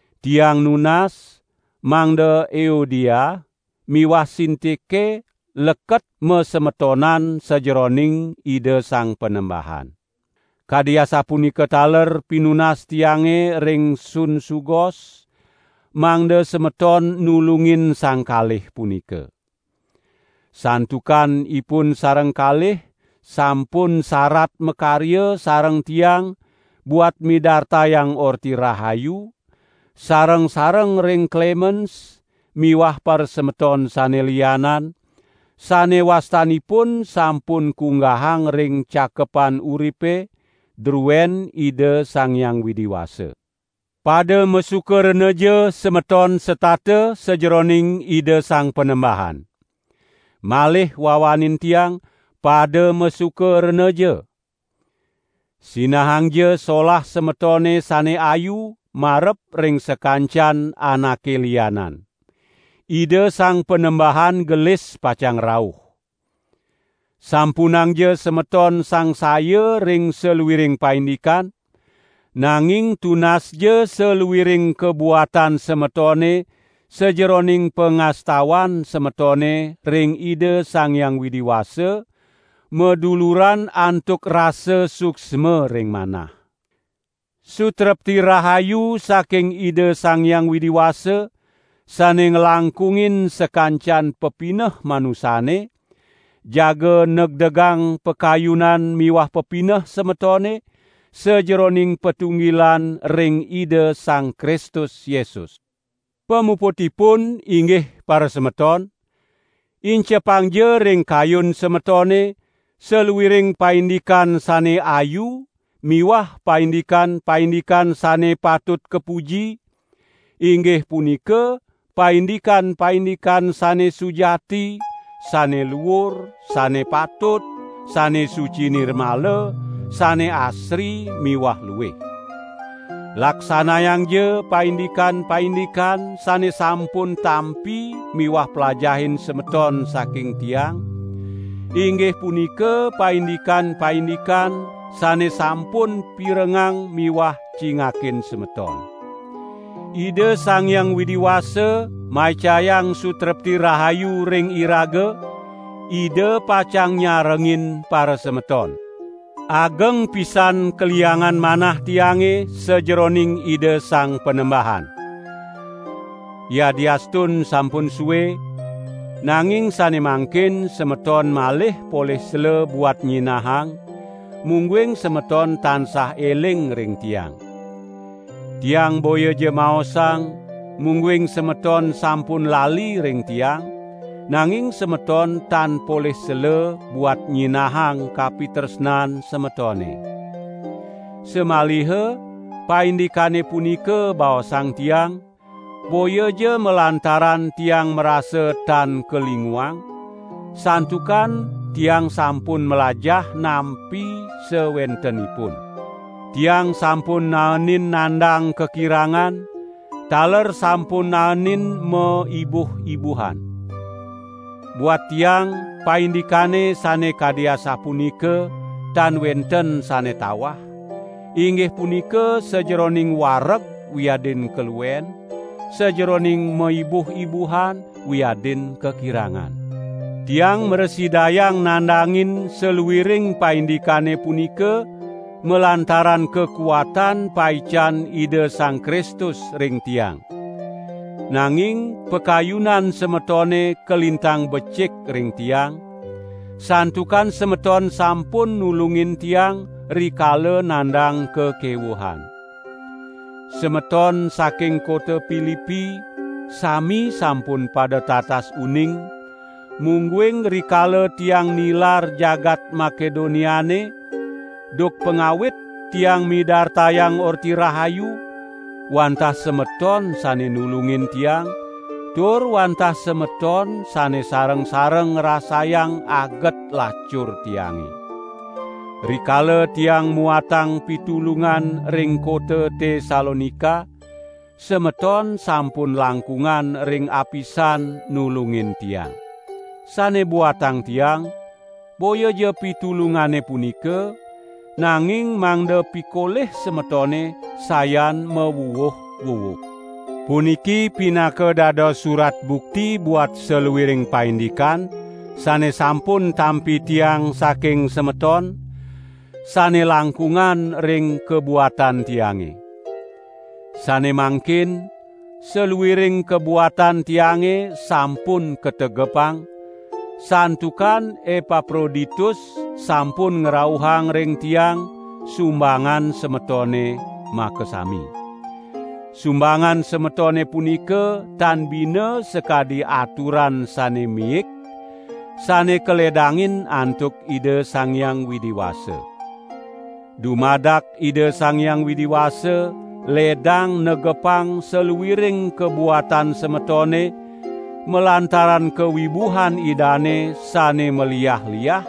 Tiang nunas, mangda Euodia miwah Sintike leket masemetonan sajeroning Ida Sang Panembahan. Kadi asapunika taler pinunas tiange ring Sunsugos, mangda semeton nulungin sang kalih punika. Santukan ipun sareng kalih sampun sarat makarya sareng tiang buat midartayang Orti Rahayu, sareng-sareng ring Klemens miwah parasemeton sane lianan, sane wastanipune sampun kunggahang ring Cakepan Uripe, druen Ida Sang Hyang Widi Wasa. Pada masuka renaja semeton setata sajeroning Ida Sang Panembahan. Malih wawanin tiang, pada masuka renaja! Sinahangja solah semetone sane ayu marep ring sakancan anake lianan. Ida Sang Panembahan gelis pacang rauh. Sampunangja semeton sangsaya ring saluiring paindikan, nanging tunasja saluiring kabuatan semetone sajeroning pangastawan semetone ring Ida Sang Hyang Widi Wasa, maduluran antuk rasa suksma ring manah. Sutrepti rahayu saking Ida Sang Hyang Widi Wasa, sane nglangkungin sakancan pepineh manusane, jaga negdegang pakayunan miwah pepineh semetone, sajeroning patunggilan ring Ida Sang Kristus Yesus. Pamuputipun inggih parasemeton, incepangja ring kayun semetone saluiring paindikan sane ayu miwah paindikan-paindikan sane patut kapuji, inggih punika paindikan-paindikan sane sujati, sane luur, sane patut, sane suci nirmala, sane asri miwah luih. Laksanayangja paindikan-paindikan sane sampun tampi miwah plajahin semeton saking tiang, inggih punika paindikan-paindikan sane sampun pirengang miwah cingakin semeton. Ida Sang Hyang Widi Wasa maicayang sutrepti rahayu ring iraga, Ida pacang nyarengin parasemeton. Ageng pisan kaliangan manah tiange sajeroning Ida Sang Panembahan! Yadiastun sampun sue, nanging sane mangkin semeton malih polih sela buat nyinahang, mungguing semeton tansah eling ring tiang. Tiang boyaja maosang, mungguing semeton sampun lali ring tiang, nanging semeton tan polih sela buat nyinahang kapitresnan semetone. Samaliha paindikane punika baosang tiang, boyaja malantaran tiang marasa tan kalinguang, santukan tiang sampun mlajah nampi sawentenipun. Tiang sampun naenin nandang kakirangan, taler sampun naenin maibuh-ibuhan. Buat tiang paindikane sane kadi asapunika tan wenten sane tawah, inggih punika sajeroning wareg wiadin kaluen, sajeroning maibuh-ibuhan wiadin kakirangan. Tiang mrasidayang nandangin saluiring paindikane punika malantaran kakuatan paican Ida Sang Kristus ring tiang. Nanging pakayunan semetone kalintang becik ring tiang, santukan semeton sampun nulungin tiang rikala nandang kakewuhan. Semeton saking kota Pilipi sami sampun pada tatas uning, mungguing rikala tiang nilar jagat Makedoniane, duk pangawit tiange midartayang Orti Rahayu, wantah semeton sane nulungin tiang, tur wantah semeton sane sareng-sareng ngrasayang aget lacur tiange. Rikala tiang muatang pitulungan ring kota Tesalonika, semeton sampun langkungan ring apisan nulungin tiang. Sane buatang tiang, boyaja pitulungane punika, nanging mangda pikolih semetone sayan mawuwuh-wuwuh. Puniki pinaka dados surat bukti buat saluiring paindikan sane sampun tampi tiang saking semeton, sane langkungan ring kabuatan tiange. Sane mangkin saluiring kabuatan tiange sampun kategepang, santukan Epaproditus sampun ngrauhang ring tiang sumbangan semetone makasami. Sumbangan semetone punika tan bina sakadi aturan sane miik, sane kaledangin antuk Ida Sang Hyang Widi Wasa. Dumadak Ida Sang Hyang Widi Wasa ledang negepang saluiring kabuatan semetone malantaran kawibuhan Idane sane maliah-liah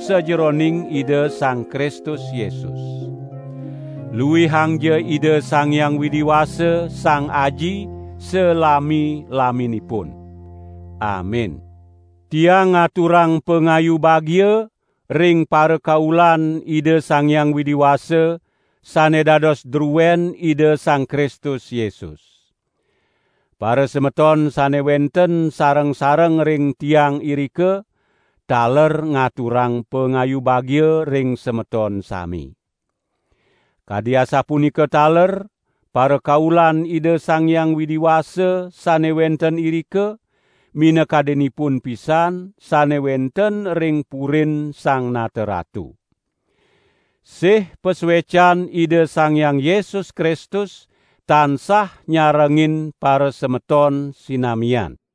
sajeroning Ida Sang Kristus Yesus. Luihangja Ida Sang Hyang Widi Wasa, Sang Aji, salami-laminipun. Amin. Tiang ngaturang pangayu bagia ring parakaulan Ida Sang Hyang Widi Wasa, sane dados druen Ida Sang Kristus Yesus. Parasemeton sane wenten sareng-sareng ring tiang irika, taler ngaturang pangayu bagia ring semeton sami. Kadi asapunika taler parakaulan Ida Sang Hyang Widi Wasa sane wenten irika, minakadinipun pisan sane wenten ring purin Sang Nata Ratu. Sih pasuecan Ida Sang Hyang Yesus Kristus tansah nyarengin parasemeton sinamian.